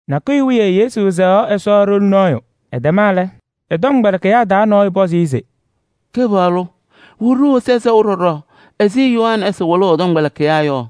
Nakʋyʋ wiye Yesu sɛɣaɣ Ɛsɔ ɖoli nɔɔyʋ. Ɛtɛma lɛ, ɛ-tɔmkpɛlɩkɩyaa taa nɔɔyʋ pɔzɩ-ɩ se: “Kɩpaɣlʋ! Wɩlɩ-ɖʋ Ɛsɔ sɛʋ ɖɔɖɔ ɛzɩ Yohanɛɛsɩ wɩlʋʋ ɛ-tɔmkpɛlɩkɩyaa yɔ.”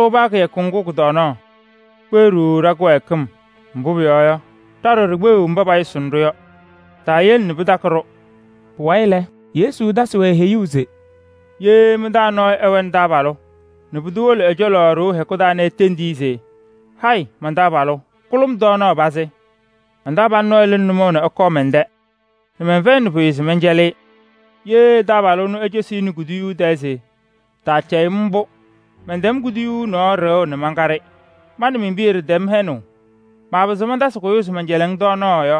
Ha-ɖʋ paa kɩyakʋ ŋgʋ kʋ-tɔɔnaɣ. Kpeɣ-ɖʋ ɖa-kɩwɛɛkɩm, mbʋ pʋyɔɔ yɔ, ɖa ɖɔɖɔ ɖikpeɣiɣ mba payʋsʋʋnɩ-ɖʋ yɔ. Taayele nɛ pɩtakɩ-ɖʋ.” Pʋwayɩ lɛ, Yesu tasɩ-wɛ heyuu se: “Ye mɩ-taa nɔɔyʋ ɛwɛnɩ taabalʋ nɛ pʋdʋ wolo ɛ-cɔlɔ ɖoo hɛkʋ taa nɛ etendi-i se: ‘Hayɩ, man-taabalʋ! Kʋlʋ-m tɔɔnaɣ pazɩ. Man-taabalʋ nɔɔyʋ lɩnɩ nʋmɔʋ nɛ ɛkɔɔ mɛn-tɛ nɛ mɛnfɛyɩnɩ pʋyʋ se mɛncɛlɩ-ɩ.’ Ye ɛ-taabalʋ ɛnʋ ecosi-i nɛ kuduyuu tɛɛ se: ‘Taacɛyɩ-m mbʋ, mɛntɛm kuduyuu nɔɔ ɖɩɣʋ nɛ mankaɖɩ. Ma nɛ men-piya ɖɩtɛm hɛnʋʋ, maapɩzɩɣ mantasɩ kʋyʋʋ se mɛncɛlɩɣ-ŋ tɔɔnaɣ’ yɔ,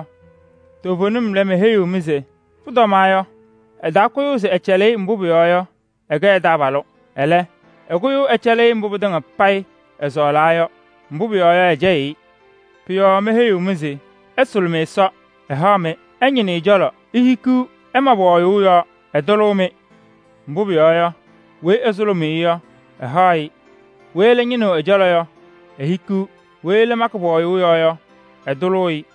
toovenim lɛ, meheyiɣ-mɩ se pʋtɔma yɔ, ɛtaakʋyʋʋ se ɛcɛlɩ-ɩ se ɛkɛ ɛ-taabalʋ. Ɛlɛ, ɛkʋyʋʋ ɛcɛlɩ-ɩ mbʋ pɩtɩŋa ɛsɔɔlaa yɔ, mbʋ pʋyɔɔ yɔ, ɛcɛyɩɣ-ɩ. Ma lɛ, meheyiɣ-mɩ se: ɩsʋlʋmɩ Ɛsɔ, ɛhaɣ-mɩ, ɩñɩnɩ ɛ-cɔlɔ, ihikiɣ, ɩma pɔɔyʋʋ yɔɔ, ɛtʋlʋʋ-mɩ. Mbʋ pʋyɔɔ yɔ, weyi ɛsʋlʋmʋʋ-ɩ yɔ, ɛhaɣ-ɩ, weyi ɛlɛ ñɩnɩɣ ɛ-cɔlɔ yɔ, ehikiɣ, weyi ɛlɛ makɩ pɔɔyʋʋ yɔɔ yɔ, ɛtʋlʋʋ-ɩ.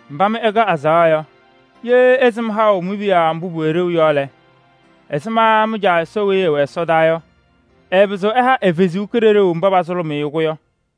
Mba mɩ ɩkɛ azaɣa yɔ, ye ɩsɩm haʋ mi-piya mbʋ pʋwɛ ɖeu yɔ lɛ, ɛzɩma mɩ-Caa Ɛsɔ weyi ɛwɛ ɛsɔdaa yɔ, ɛɛpɩzɩɣ ɛha ɛ-Kalɩzaɣ mba pasʋlʋmʋʋ-ɩ-kɛ yɔ?”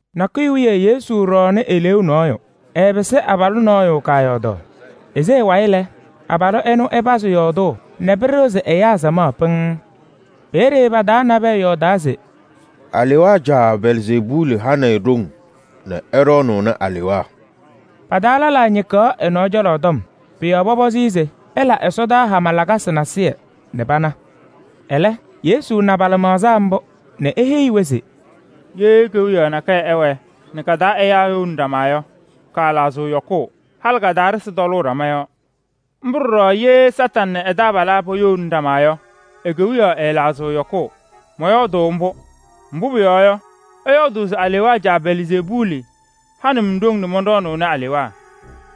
Nakʋyʋ wiye Yesu ɖɔɔnɩ eleeu nɔɔyʋ. Ɛɛpɩsɩ abalʋ nɔɔyʋ kaayɔɔdaɣ. Ese ɛ-wayɩ lɛ, abalʋ ɛnʋ ɛpazɩ yɔɔdʋʋ nɛ pɩɖɩɣzɩ ɛyaa samaɣ pɩŋŋ. Peeye pa-taa nabɛyɛ yɔɔdaa se: “Alewaa caa Belzeebuuli hanɩ-ɩ ɖoŋ nɛ ɛɖɔɔnʋʋnɩ alewaa.” Pa-taa lɛlaa ñɩkaɣ ɛ-nɔɔ cɔlɔ tɔm. Pʋ-yɔɔ pɔpɔzɩ-ɩ se ɛla ɛsɔdaa hama lakasɩ nasɩyɩ nɛ pana. Ɛlɛ Yesu na pa-lɩmaɣza mbʋ nɛ eheyi-wɛ se: “Ye kewiyaɣ nakɛyɛ ɛwɛɛ nɛ ka-taa ɛyaa youni ɖama yɔ, kaalaɣzɩɣ yɔkʋʋ. Halɩ ka-taa ɖɩsɩ tɔlʋʋ ɖama yɔɔ. Mbʋ ɖɔɖɔ ye Kañadʋ Satanɩ nɛ ɛ-taabalaa poyouni ɖama yɔ, e-kewiyaɣ ɛɛlaɣzɩɣ yɔkʋʋ. Mɔyɔɔdʋʋ mbʋ, mbʋ pʋyɔɔ yɔ, ɩyɔɔdʋʋ se alewaa caa Belzeebuuli hanɩ-m ɖoŋ nɛ mɔnɖɔɔnʋʋnɩ alewaa.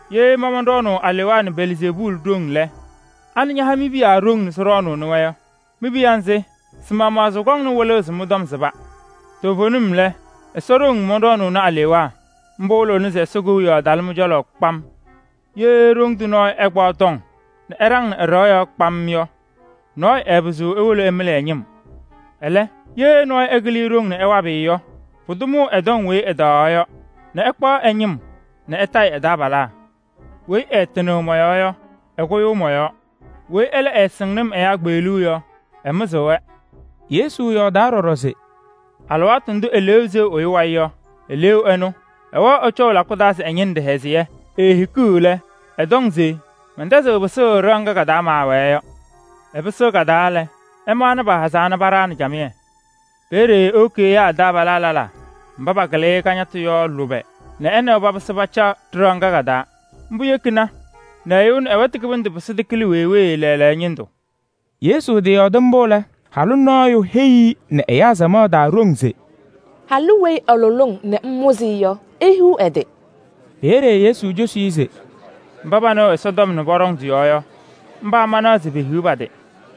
Ye ma mɔnɖɔɔnʋʋ alewaa nɛ Belzeebuuli ɖoŋ lɛ, anɩ ñaha mi-piya ɖoŋ nɛ sɩɖɔɔnʋʋnɩ-wɛ yɔ? Mi-piya nzɩ, sɩ-maɣmaɣ sɩkɔŋnɩ wɩlʋʋ se mɩ-tɔm sɩba. Toovenim lɛ, Ɛsɔ ɖoŋ mɔnɖɔɔnʋʋnɩ alewaa. Mbʋ wɩlɩɣna se Ɛsɔ Kewiyaɣ talɩ mɩ-cɔlɔ kpam. Ye ɖoŋ tʋ nɔɔyʋ ɛkpaɣ tɔŋ nɛ ɛɖaŋ ɛ-ɖɩɣa yɔɔ kpam yɔ, nɔɔyʋ ɛɛpɩzɩɣ ewolo ɛmɩlɩ ɛ-ñɩm. Ɛlɛ, ye nɔɔyʋ ɛkɩlɩ-ɩ ɖoŋ nɛ ɛwabɩ-ɩ yɔ, pʋdʋ mʋʋ ɛ-tɔŋ weyi ɛtaɣaɣ yɔ nɛ ɛkpaɣ ɛ-ñɩm nɛ ɛtayɩ ɛ-taabalaa. Weyi ɛɛtɩnɩɣ mɔ-yɔɔ yɔ, ɛkʋyʋʋ mɔ-yɔɔ. Weyi ɛlɛ ɛɛsɩŋnɩ-m ɛyaa kpeɣluu yɔ, ɛmɩzɩɣ-wɛ.” Yesu yɔɔdaa ɖɔɖɔ se: “Alɩwaatʋ ndʋ eleeu seɣ ɛyʋ wayɩ yɔ, eleeu ɛnʋ ɛwɛɣ ɛcɔʋ lakʋ taa se ɛñɩnɩ ɖɩhɛzɩyɛ. Eehikiɣ lɛ, ɛtɔŋ se: ‘Mɛntɛzɩɣ pɩsʋʋ ɖɩɣa ŋga ka-taa maawɛɛ yɔ.’ Ɛpɩsɩɣ ka-taa lɛ, ɛmaɣna pahazaa nɛ paɖaɣnɩ camɩyɛ. Peeye ewoki ɛyaa ɛ-taabalaa lɛlaa mba pakɩlɩ-ɩ kañatʋ yɔ lʋbɛ nɛ ɛ nɛ wɛ papɩsɩ pacaɣ ɖɩɣa ŋga ka-taa. Mbʋ yekina nɛ ɛyʋ ɛnʋ ɛ-wɛtʋ kɩbɩndʋ pɩsɩ tɩkɩlɩ wee wee lɛɛlɛɛyɔ ñɩndʋ.” Yesu tɩyɔɔdɩ mbʋ lɛ, halʋ nɔɔyʋ heyi-i nɛ ɛyaa samaɣ taa ɖoŋ se: “Halʋ weyi ɛlʋlɩ-ŋ nɛ ŋmʋzɩ-ɩ yɔ, ehiɣ ɛ-tɩ!” Peeye Yesu cosi-i se: “Mba panɩɣ Ɛsɔtɔm nɛ pɔɖɔŋ tɩ-yɔɔ yɔ, mba manaɣ se pehiɣ pa-tɩ.”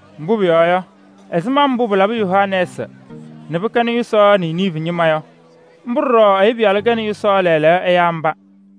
Mbʋ pʋyɔɔ yɔ, ɛzɩma mbʋ pɩlabɩ Yoonaasɩ nɛ pɩkɛnɩ yʋsaɣ Niniivi ñɩma yɔ, mbʋ ɖɔɖɔ Ɛyʋ Pɩyalʋ kɛnɩ yʋsaɣ lɛɛlɛɛyɔ ɛyaa mba.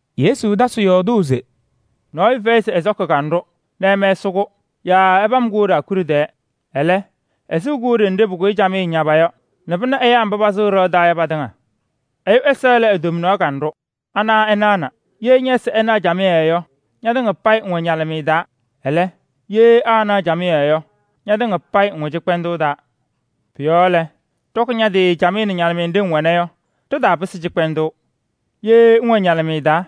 Yesu tasɩ yɔɔdʋʋ se: “Nɔɔyʋ fɛyɩ se ɛsɔkɩ kanɖʋ nɛ ɛmɛsɩ-kʋ yaa ɛpam-kʋ ɖaakuɖe tɛɛ. Ɛlɛ, ɛsɩɣ-kʋ ɖenɖe pʋkʋyɩ camɩyɛ ñaba yɔ nɛ pɩna ɛyaa mba pasʋʋ ɖɩɣa taa yɔ patɩŋa. Ɛyʋ ɛza lɛ e-tomnaɣ kanɖʋ, ana ɛnaɣna. Ye ñɛ-ɛza ɛnaɣ camɩyɛ yɔ, ñatɩŋa payɩ ŋwɛ ñalɩmɩyɛ taa. Ɛlɛ, ye aanaɣ camɩyɛ yɔ, ñatɩŋa payɩ ŋwɛ cɩkpɛndʋʋ taa. Pʋ-yɔɔ lɛ, ɖɔkɩ ña-tɩ camɩyɛ nɛ ñalɩmɩyɛ nɖɩ ŋwɛna yɔ, ɖɩtaapɩsɩ cɩkpɛndʋʋ. Ye ŋwɛ ñalɩmɩyɛ taa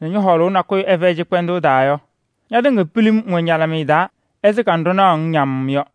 nɛ ñɔ-hɔɔlʋʋ nakʋyʋ ɛfɛyɩ cɩkpɛndʋʋ taa yɔ, ñatɩŋa pilim ŋwɛ ñalɩmɩyɛ taa ɛzɩ kanɖʋ naɣʋ-ŋ ñamm yɔ.”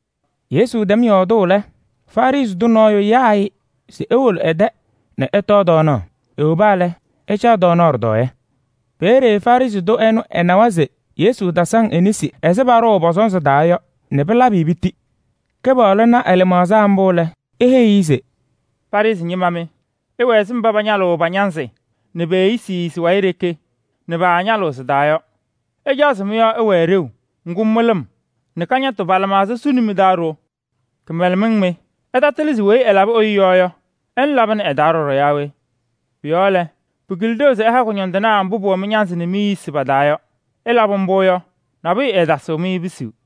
Yesu tɛm yɔɔdʋʋ lɛ, Farɩsɩ tʋ nɔɔyʋ yaa-ɩ se ewolo ɛ-tɛ nɛ ɛtɔɔ tɔɔnaɣ. Ewoba lɛ, ɛcaɣ ɖɩtɔɔyɛ. Peeye Farɩsɩ tʋ ɛnʋ ɛnawa se Yesu tasaŋ e-nesi ɛzɩ paɖʋʋ pɔ-sɔnzɩ taa yɔ nɛ pɩlabɩ-ɩ piti. Kɩpaɣlʋ na ɛ-lɩmaɣza mbʋ lɛ, eheyi-i se: “Farɩsɩ ñɩma mɩ! Ɩwɛ ɛzɩ mba pañalɩɣ pa-ñanzɩ nɛ pe-eyisi pa-wayɩ ɖeke nɛ paañalɩɣ sɩ-taa yɔ. Ɩcaɣ se mɩ-yɔɔ ɛwɛɛ ɖeu, ŋgʋ mɩlɩm nɛ kañatʋ pa-lɩmaɣza suni mɩ-taa ɖo. Kɩmɛlɛmɩŋ mɩ! Ɩtatɩlɩ se weyi ɛlabɩ ɛyʋ yɔɔ yɔ, ɛnʋ labɩnɩ ɛ-taa ɖɔɖɔ yaa we? Pʋ-yɔɔ lɛ, pɩkɩlɩ ɖeu se ɩha kʋñɔndɩnaa mbʋ pʋwɛ mɩ-ñanzɩ nɛ mi-eyisi pa-taa yɔ. Ɩlabɩ mbʋ yɔ, nabʋyʋ ɛɛtasɩɣ-mɩ pisuu.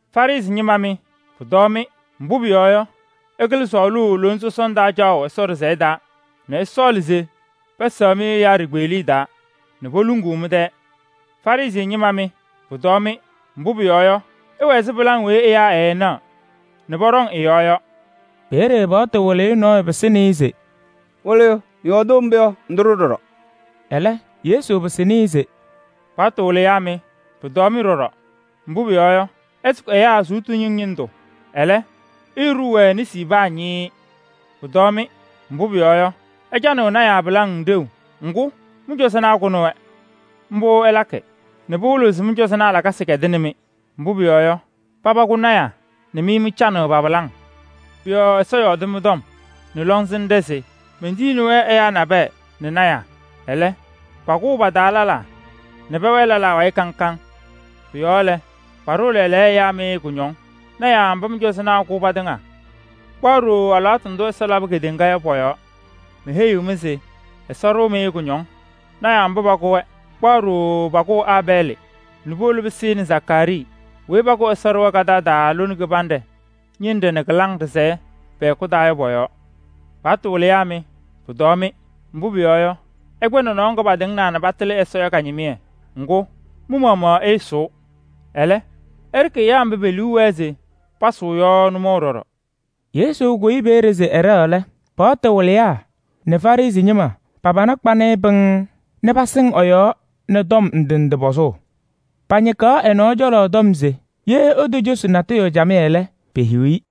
Farɩsɩ ñɩma mɩ, pʋtɔɔ-mɩ! Mbʋ pʋyɔɔ yɔ, ɩkɩlɩ sɔɔlʋʋ lona sɔsɔna taa caɣʋ Ɛsɔ ɖɩsɛyɛ taa nɛ ɩsɔɔlɩ se pɛsɛɣ-mɩ ɛyaa ɖikpeɣliye taa nɛ poluŋuu mɩ-tɛɛ. Farɩsɩ ñɩma mɩ, pʋtɔɔ-mɩ! Mbʋ pʋyɔɔ yɔ, ɩwɛ ɛzɩ pɩlaŋ weyi ɛyaa ɛɛnaɣ nɛ pɔɖɔŋ ɩ-yɔɔ yɔ.” Peeye paɣtʋ wɩlɩyʋ nɔɔyʋ pɩsɩnɩ-ɩ se: “Wɩlɩyʋ! Ŋyɔɔdʋʋ mbʋ yɔ, ŋtʋ-ɖʋ ɖɔɖɔ.” Ɛlɛ Yesu pɩsɩnɩ-ɩ se: “Paɣtʋ wɩlɩyaa mɩ, pʋtɔɔ-mɩ ɖɔɖɔ! Mbʋ pʋyɔɔ yɔ, ɩsʋkɩ ɛyaa sʋʋtʋ yuŋ ñɩndʋ, ɛlɛ, ɩɩɖʋʋ-wɛ nesi paa ñɩɩɩ. Pʋtɔɔ-mɩ! Mbʋ pʋyɔɔ yɔ, ɩcanɩɣ lɔɔyɩsɩ tɩnaa pɩlaŋ ɖeu. Ŋgʋ, mɩ-cɔzɔnaa kʋnɩ-wɛ. Mbʋ ɩlakɩ nɛ pɩwɩlɩɣ se mɩ-cɔzɔnaa lakasɩ kɛdɩnɩ-mɩ. Mbʋ pʋyɔɔ yɔ, paba kʋ lɔɔyɩsɩ tɩnaa nɛ mɩ mɩcanɩɣ pa-pɩlaŋ. Pʋ-yɔɔ lɔŋsɩnɖʋ Ɛsɔ yɔɔdɩ mɩ-tɔm se: ‘Mentiyiɣni-wɛ ɛyaa nabɛyɛ nɛ lɔɔyɩsɩ tɩnaa. Ɛlɛ, pakʋʋ pa-taa lɛlaa nɛ pɛwɛɛ lɛlaa wayɩ kaŋ kaŋ.’ Pʋ-yɔɔ lɛ, paɖʋʋ lɛɛlɛɛyɔ ɛyaa mɩ kʋñɔŋ lɔɔyɩsɩ tɩnaa mba mɩ-cɔzɔnaa kʋ patɩŋa kpaɣ ɖooo alɩwaatʋ ndʋ Ɛsɔ labɩ kedeŋa yɔ pɔ-yɔɔ. Meheyiɣ-mɩ se: Ɛsɔ ɖʋʋ-mɩ kʋñɔŋ lɔɔyɩsɩ tɩnaa mba pakʋ-wɛ kpaɣ ɖooo pakʋʋ Aabɛɛlɩ nɛ puwolo pɩsɩnɩ Zakaarii weyi pakʋ Ɛsɔ ɖɩɣa kadaɣ taa lone kaɖɛ ñɩnɖɛ nɛ kɩlaŋ ɖɩlayɛ pɛ-hɛkʋ taa yɔ pɔ-yɔɔ. Paɣtʋ wɩlɩyaa mɩ, pʋtɔɔ-mɩ! Mbʋ pʋyɔɔ yɔ, ɩkpɛ nɔnɔɔ ŋga patɩŋɩɣna nɛ patɩlɩ Ɛsɔ yɔ ka-ñɩmɩyɛ. Ŋgʋ, mɩ-maɣmaɣ ɩɩsʋʋ, ɛlɛ ɩɖɩkɩ mba pe-liu wɛɛ se pasʋʋ yɔ nʋmɔʋ ɖɔɖɔ.” Yesu kʋyɩ peeye se ɛɖɛɣ lɛ, paɣtʋ wɩlɩyaa nɛ Farɩsɩ ñɩma pa-pana kpanɩ-ɩ pɩŋŋ nɛ pasɩŋ ɛ-yɔɔ nɛ tɔm ndɩ ndɩ pɔzʋʋ. Pañɩkaɣ ɛ-nɔɔ cɔlɔ tɔm se ye etocosi natʋyʋ camɩyɛ lɛ, pehiɣ-i.